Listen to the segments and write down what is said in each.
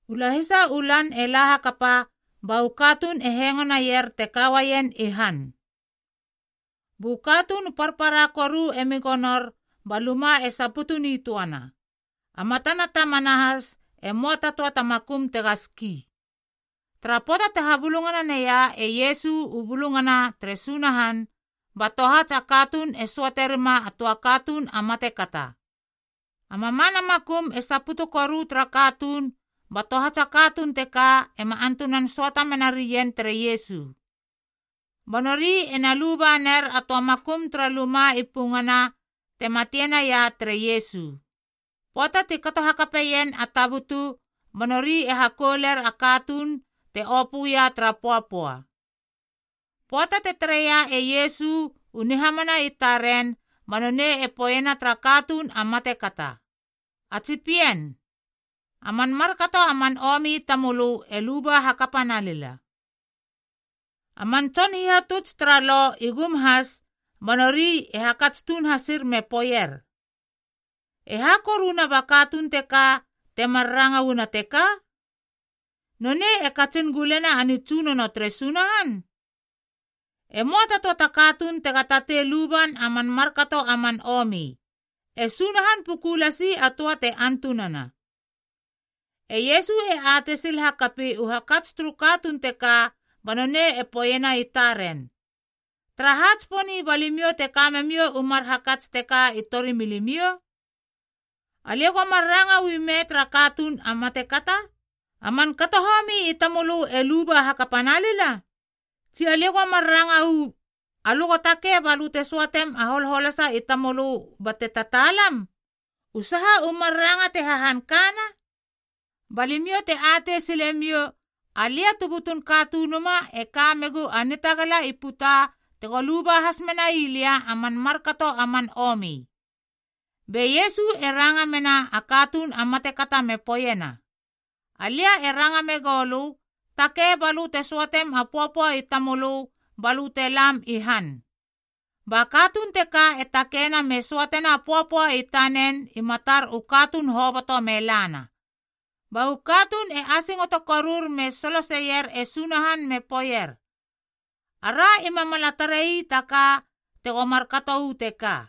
U lahisa u lan e la hakapa, ba u katuun e hengo naier te ka uaien i han. Bu katuun u parpara koru emi gonor ba luma e saputu nitöana, a matana tamana has e möa ta töa ta makum tega ski. Tara pöata te habulungana naia e Iesu u bulungana tere Sunahan, ba tohats a katuun e söate rima a töa katuun a matekata. A mamana makum e saputu koru tara katuun ba tohats a katuun teka ema antunan söata menarien tere Iesu. Ba nori ena luba ner a töa makum tara luma i pungana te matina ia tere Iesu. Pöata ti kato hakapeien a tabutu, ba nori e hakouler a katuun te opöia tara pöapöa. Pöata te tareia e Iesu u nihamana i taren ba nonei e poeiena tara katuun a matekata, “A tsi pien, a man markato a man omi i tamölö e luba hakapa na lila.” A man tson hihatuts tara Lo i gum has ba nori e hakats tuun hasir me poeier, “E ha koruna ba katuun teka temar ranga uana teka? Nonei e katsin gulena a nitsunono tere Sunahan? E möa ta töa ta katuun tega tatei luban a man markato a man omi, e Sunahan puku lasi a töa te antunana.” E Iesu e atei sil hakapi u hakats turu katuun teka ba nonei poeiena i taren, “Taraha tsiponi ba limiou te ka memiou u mar hakats teka i tori milimiou? Alia go mar ranga uu ime tara katuun a matekata? ‘A man kato homi i tamölö e luba hakapa nalila?’ Tsi, alia go mar ranga uu, ‘Alö go takei bate söatem a holholasa i tamölö bate tataalam?’ U saha u mar ranga te hahan kana? Ba limiou te atei sile miou, alia tu butun Katunuma e ka megu a nitagala i puta tego luba has menai lia a man markato a man omi.” Be Iesu e ranga mena a katuun a matekata me poeiena, “Alia e ranga megou lö, takei balö te söatem a holholasa i tamölö ba lö te lam i han.” Ba katuun teka e takeina me söatena a pöapöa i tanen i matar u katuun hoboto me lana. Ba u katuun e asingoto korur me soloseier e Sunahan me poeier, “Ara ima mala tarei ta ka tego markato uu teka!”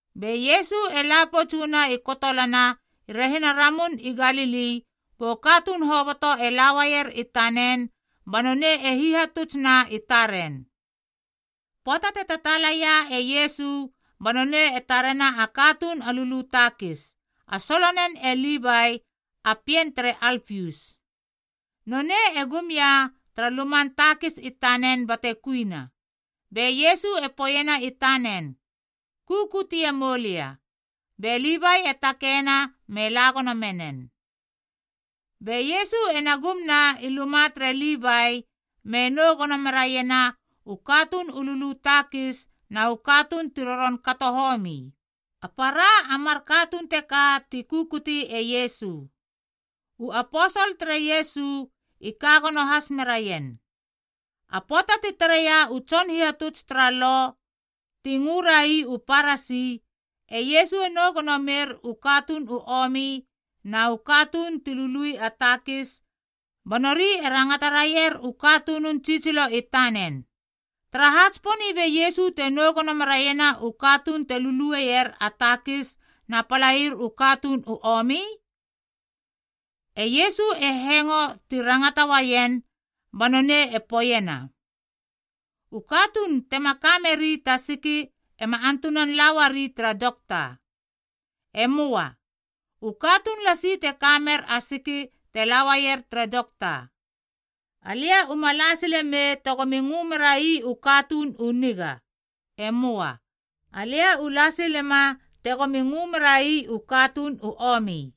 Be Iesu e la pouts uana i kotolana i rehina Ramun i Galili bu katuun hoboto e la uaier i tanen ba nonei e hihatutsna i taren. Pöata te tataalaia e Iesu ba nonei e tarena a katuun a lulu takis, a solonen e Livai a pien tere Alpius, nonei e gum ia tara luman takis i tanen bate kuina. Be Iesu e poeiena i tanen, “Kukutie moulia.” Be Livai e takeina me la gono menen. Be Iesu ena gumna i luma tere Livai me nou gono meraiena u katuun u lulu takis na u katuun ti roron kato homi.a A para a mar katuun teka ti kukuti e Iesu. U aposol tere Iesu i ka gono has meraien. A pöata ti tareia u tson hihatuts tara Lo (ti ngörai u Parasi) e Iesu e nou gono mer u katuun u omi na u katuun ti lului a takis, ba nori e rangata raier u katunun tsitsilo i tanen, “Taraha tsiponi be Iesu te nou gono meraiena u katuun te lulueier a takis na palair u katuun u omi?” E Iesu e hengo ti rangata uaien ba nonei e poeiena, “U katuun tema ka meri ta siki ema antunan la uari tara dokta. E möa. U katuun lasi te ka mer a siki te la uaier tere dokta. Alia uma la sile mei tegomi ngö merai u katuun u niga. E möa. Alia u la silema tegomi ngö merai u katuun u omi.”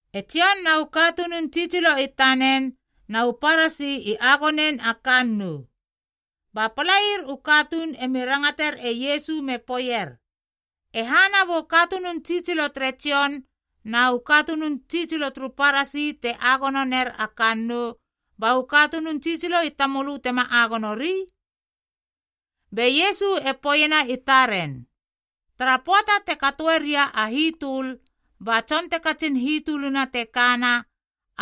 E Jon na u katunun tsitsilo i tanen na u Parasi i agonein a kannoub. Ba palair u katuun emi rangater e Iesu me poeier, “E hana bu katunun tsitsilo tere Jon na u katunun tsitsilo turu Parasi te agono ner a kannou, ba u katunun tsitsilo i tamölö tema agonori?” Be Iesu e poeiena i taren, “Tara pöata te katoeria a hitöl, ba tson te katsin hitölina te kana,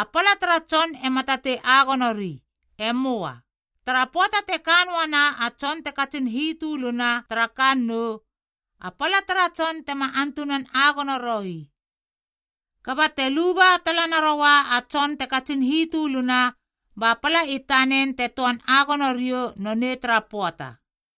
a pala tara tson ema tatei agonori. E möa. Tara pöata te ka noana a tson te katsin hitöluna tara kannou, a pala tara tson tema antunan agonoroi. Kaba te luba tala naroua a tson te katsin hitöluna,c ba pala i tanen te töan agono riou nonei tara pöata.”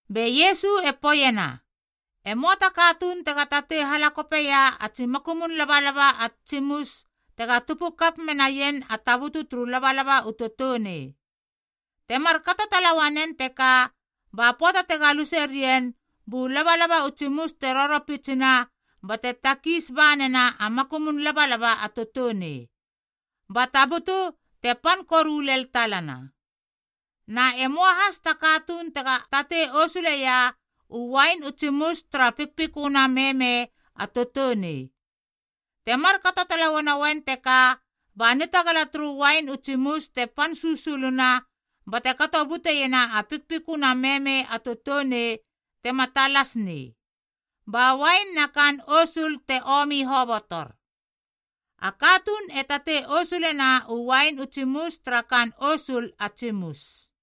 Be Iesu e poeiena, “E möa ta katuun tega tatei halakopeia a tsi makumun labalaba ats tsimus tega tupu kap menaien a tabutu turu labalaba u toutounei. Te markato tala uanen teka ba pöata te galuse rien, bu labalaba u tsimus te roropitsina bate takiis ba nena a makumun labalaba a toutounei, ba tabutu te pan koru lel talana. Na e möa has ta katuun tega tatei osuleia u uain u tsimus tara pikpiköna meme a toutounei. Te markato tala uanoen teka ba nitagala turu uain u tsimus te pan susuluna bate kato buteiena a pikpiköna meme a toutounei tema talas nei, ba uain na kaan o osul te omi hobotor. A katuun e tatei osulena u uain u tsimus tara kaan osul a tsimusd.”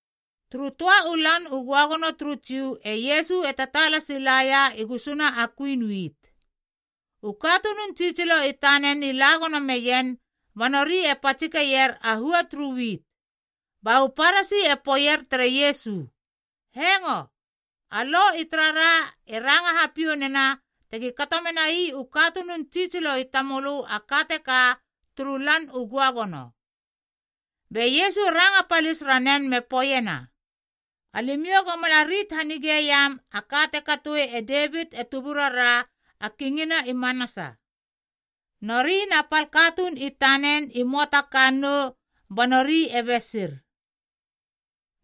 Turu töa u Lan u Göagono turu Jiu e Iesu e tataala silaia i gusuna a kuin wit. U katunun tsitsilo i tanen i la gono meien ba nori e patsikeier a hua turu wit. Ba u Parasi e poeier tere Iesu, “Hengo, a Lo i tarara e ranga hapiou nena tegi kato menai u katunun tsitsilo i tamölö a ka teka turu Lan u Göagono.” Be Iesu e ranga palis ranen me poeiena, “Alimiou go mala rit hanigeiam a ka te katoe e Devit e tuburara a kingina i manasa. Nori na pal katuun i tanen i möa ta kannou ba nori e besir.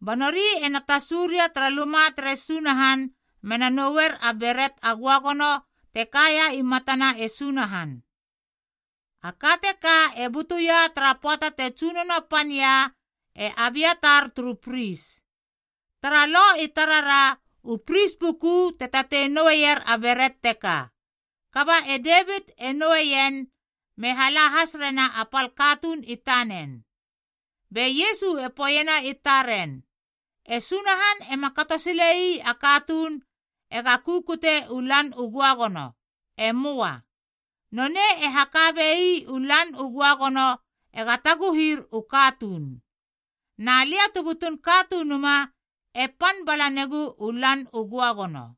Ba nori ena tasu ria tara luma tere Sunahan mena noueier a beret a göagono te kaia i matana e Sunahan. A ka teka e butuia tara pöata te tsunono pania e Abiatar turu pris. Tara Lo i tarara u pris puku te tatei noueier a beret teka. Kaba e Devit e noueien me hala has rena a pal katuun i tanen.” Be Iesu e poeiena i taren, “E Sunahan ema kato sile ii a katuun ega kukute u Lan u Göagono. E möa. Nonei e haka bei u Lan u Göagono ega taguhir u katuun. Na lia tu butun Katunuma e pan bala negu u Lan u Göagono.”